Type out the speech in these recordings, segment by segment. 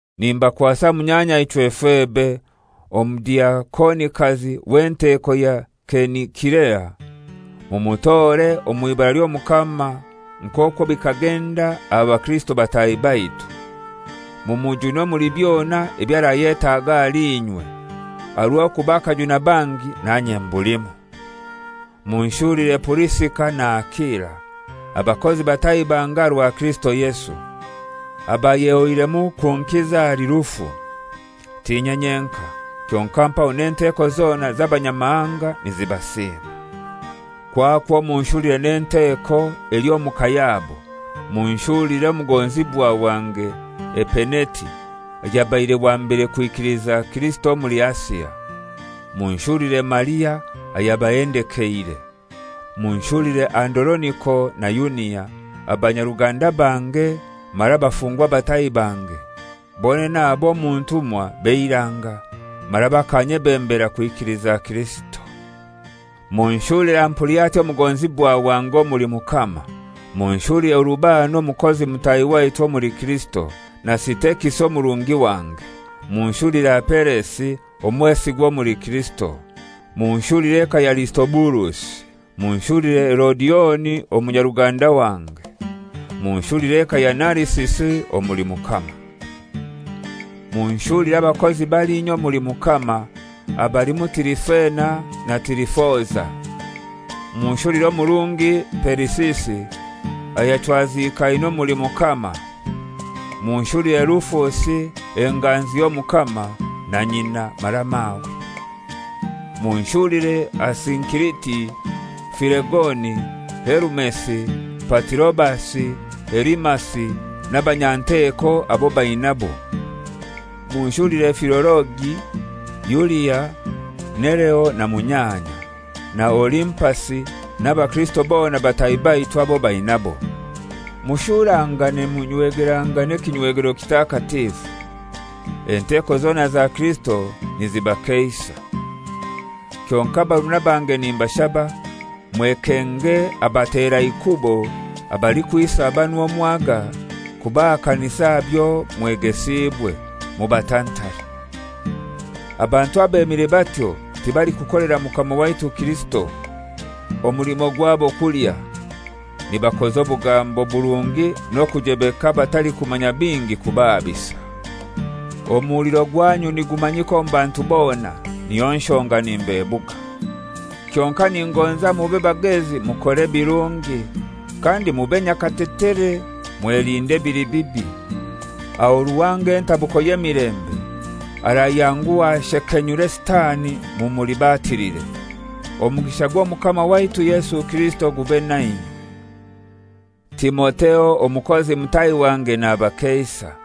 Nimbakwasa munyanyaichwe Febe, omudiakonikazi w'enteko ya Kenikirea, mumutore omw'ibara ly'Omukama nk'okwo bikagenda aha bakirisito bataahi baitu, mumujune omuli byona ebyo arayetaaga ahali inywe, aha rw'okuba akajuna bangi nanye mbulimu. Munshulire Purisika na Akila, abakozi bataahi bange aha rwa Kirisito Yesu, abayehoiremu kunkiza ahali rufu. T'inye nyenkai, kyonkai mpaho n'enteko zona z'Abanyamahanga nizibasiima. Kwakwo munshulire n'enteko eli omu ka yabo. Munshulire omugonzibwa wange Epeneti ayabaire wa mbere kwekiliza Kirisito omuli Asia. Munshulire Maria ayabahendekeire. Munshulire Andoroniko na Yunia, abanyaruganda bange mara abafungwa bataahi bange: Bonene abo omu ntumwa b'eiranga mara bakanyebembera kwikiliza Kirisito. Munshulire Ampuliati, omugonzibwa wange omuli Mukama. Munshulire Urubano, omukozi mutahi waitu omuli Kirisito, na Sitekisi omurungi wange. Munshulire Apelesi, omwesigwa omuli Kirisito. Munshulire eka ya Arisitobulusi. Munshulire Herodioni omunyaruganda wange. Munshulire eka ya Narisisi omuli Mukama. Munshulire abakozi balinya omuli Mukama, abalimu Tirifena na Tirifoza. Munshulire omurungi Perisisi, ayachwaziikaine omuli Mukama; Munshulire Rufusi, enganzi y'Omukama, na nyina mara mawe. Munshulire Asinkiriti, Filegoni, Herumesi, Patirobasi, Herimasi n'abanyanteko abo bainabo. Munshulire Filologi, Yulia, Nereo na munyanya, na Olimpasi n'abakirisito bona bataahi baitu abo bainabo. Mushurangane nimunywegerangana ekinywegero kitakatifu. Enteko zona za Kirisito nizibakeisa. Kyonkai barumuna bange nimbashaba, mwekenge abateraikubo abalikwisa banu omwaga, kubahakanisa aha byo mwegesiibwe; mubatantare. Abantu abemire batyo tibalikukolera Mukama waitu Kirisito. Omulimo gwabo kulya. Nibakoza obugambo burungi n'okujebeka abatalikumanya bingi kubahabisa. Omuhuliro gwanyu nigumanyika omu bantu bona, niyo nshonga nimbebuga. Kyonkai ningonza mube bagezi mukore ebirungi, kandi mube nyakatetere mwelinde ebili bibi. Aho Ruhanga, entabuko y'emilembe, arayanguha ashekenyure Sitani mumulibatilire. Omugisha gw'Omukama waitu Yesu Kirisito gube nainywe. Timotheo omukozi mutahi wange nabakeisa;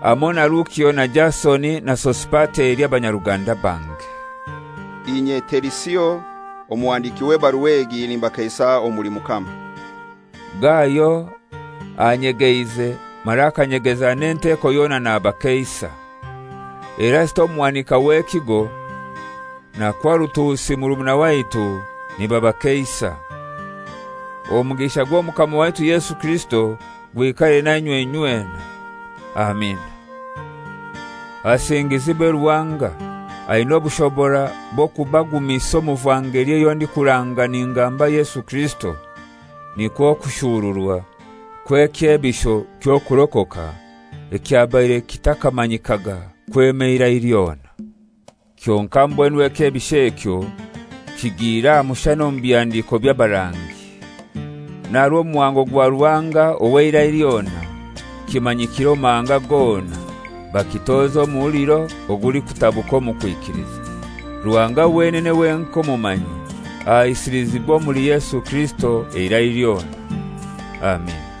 hamoi na Lukio na Jasoni na Sosipateri abanyaruganda bange. Inye Terisio, omuhandiki w'ebarua egi nimbakeisa omuli Mukama. Gayo anyegeize mara akanyegeza n'enteko yona nabakeisa. Erasito omuhanika w'ekigo, na Kwarutusi murumuna waitu, nibabakeisa. [ Omugisha gw'Omukama waitu Yesu Kirisito gwikare nainywe inywena. Amina.] Asingizibwe Ruhanga, aina obushobora bw'okubagumisa omu vangeli eyo ndikuranga ningamba Yesu Kirisito, nikwo kushuuruwa kw'ekyebisho ky'okurokoka ekyabaire kitakamanyikaga kwema eirai lyona. Kyonkai mbwenu ekyebisho ekyo kihigire aha mushana omu bihandiko by'abarangi, n'aha rw'omuhango gwa Ruhanga ow'eirai lyona kimanyikire omu mahanga gona, bakitoze omuhuliro ogulikutabuka omu kwikiliza. Ruhanga wenene wenkai omumanyi, ahaisilizibwe omuli Yesu Kirisito eirai lyona. Amina